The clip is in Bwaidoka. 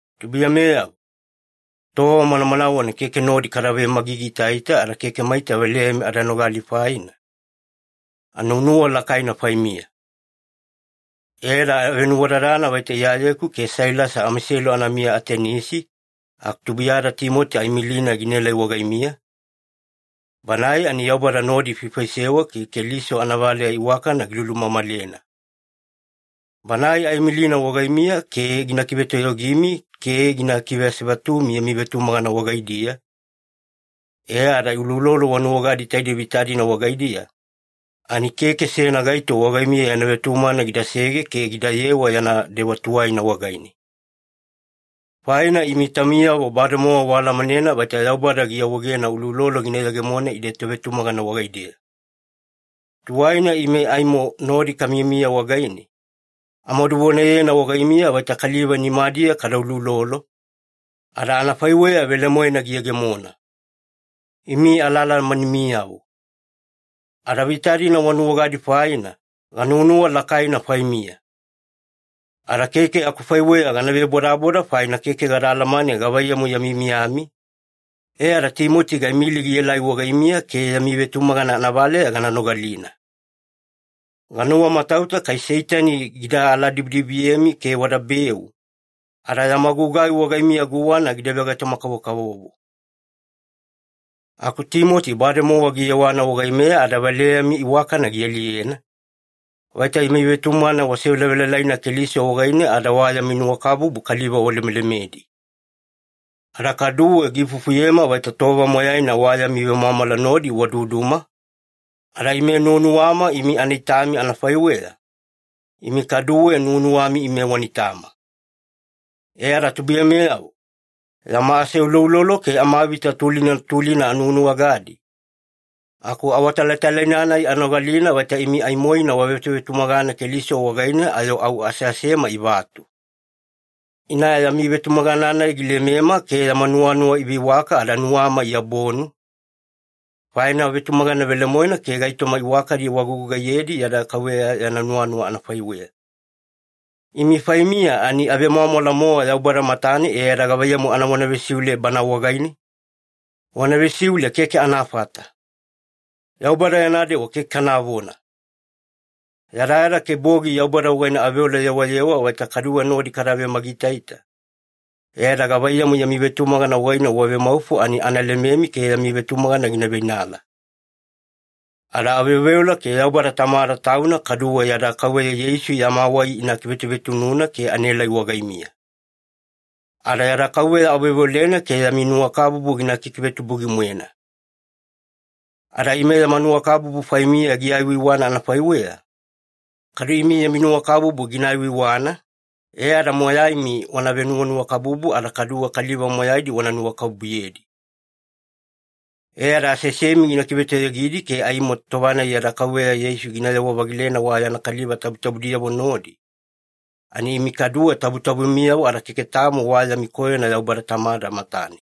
Tubuiyameyavo, tova manamanawena keke nodi kada vemagigiitaita ada keke maita valeyami ada nogali faina, anuwanuwa lakaina faimiya. E ada avenuwadadana vaita Iyayeku ke Sailasi amaiselu anamiya Atenisi aku tubuiyada Timoti aimilina gielai wagaimiya, banae ani Yaubada nodi ifaifaisewa ke Keliso anavaleya iwakana gilulumamalena. Banae aimilina wagaimiya ke gina kivetoyogimi ke gina kiveasevatumi yami vetumagana wagaidiya, e ada uloulolo wanuwagadi taidei vita-dina wagaidiya, ani keke seyana gaito wagaimiya yana vetumagana gidasege ke gidayewa yana dewa tuwaina wagaine. Faina imi taumiyavo bademowa waalamanena vaita Yaubada giawaegena uloulolo gina yegemona ide tovetumagana wagaideya. Tuwaina ime aimo nodi kamiyamiya wagaine, amaduvonayena wagaimiya vaita kaliva nimadiya kada uloulolo, ada anafaiweya velemoena giyegemona. Imi alaalamanimiyavo. Ada vita-dina wanuwagadi faina, ganuwanuwa lakaina faimiya. Ada keke akufaiweya gana vebodaboda faina keke gada alamane gavaiyamu yami miyami, e ada Timoti gaimili gielai wagaimiya ke yami vetumagana anavaleya gana nogalina. Ganuwamatauta kai Seitani gida aladibidibiyemi ke wadabeu, ada yama gugai wagaimiya guwana gida vegaitoma-kavokavovo. Aku Timoti bademowa giyewana wagaimeya ada valeyami iwakana gialiyena, vaita yami vetumagana wasevelavelalaina Keliso wagaine ada wa yami nuwakabubu kaliva walemelemedi. Ada kaduwe giifufuyema vaita tova moyaina wa yami vemwamwala nodi waduduma, ada ime nuwanuwama imi ana itami anafaiweya, imi kaduwe nuwanuwami ime wana itama. E ada tubuiyameyavo, yama aseuloulolo ke amavita tulina tulina anuwanuwagadi, aku awatalatalaina-nai anogalina vaita imi aimoina wavetuvetumagana Keliso wagaine ayo au aseasema ivatu. Ina yami vetumagana-nai gilemema ke yama nuwanuwa iveiwaka ada nuwama iabonu, faina wavetumagana velemoena ke gaitoma iwakadi wagugugaiyedi yada Kauveya yana nuwanuwa anafaiweya. Imi faimiya ani avemwamwala-mowa Yaubada matane, e ada gavaiyamu anavona vesiule Bana wagaine? Vona vesiule keke anafata. Yaubada yana dewa keke kanavona! Yadayada ke bogi Yaubada wagaine aveola yewayewa vaita kaduwe nodi kada vemagigiitaita, e ada gavaiyamu yami vetumagana wagaine wavemaufo ani ana lememi ke yami vetumagana gina veinala. Ada aveoveola ke Yaubada Tamada Tauna kaduwe yada Kauveya Yeisu yama wai ina kivetuvetununa ke anaelai wagaimiya. Ada yada Kauveya aveoveolena ke yami nuwakabubu gina kikivetubugi-moena. Ada ime yama nuwakabubu faimiya giaiwaiwana anafaiweya, kadu imi yami nuwakabubu gina aiwaiwana, e ada moyaimi wana venuwanuwakabubu ada kaduwe kaliva moyaidi wana nuwakabubuyedi. E ada aseasemi gina kivetoyogidi ke aimo tova-nai yada Kauveya Yeisu ginayewa-vagilena wa yana kaliva tabutabudiyavo nodi, ani imi kaduwe tabutabumiyavo ada keke tamo wa yami koyona Yaubada Tamada matane.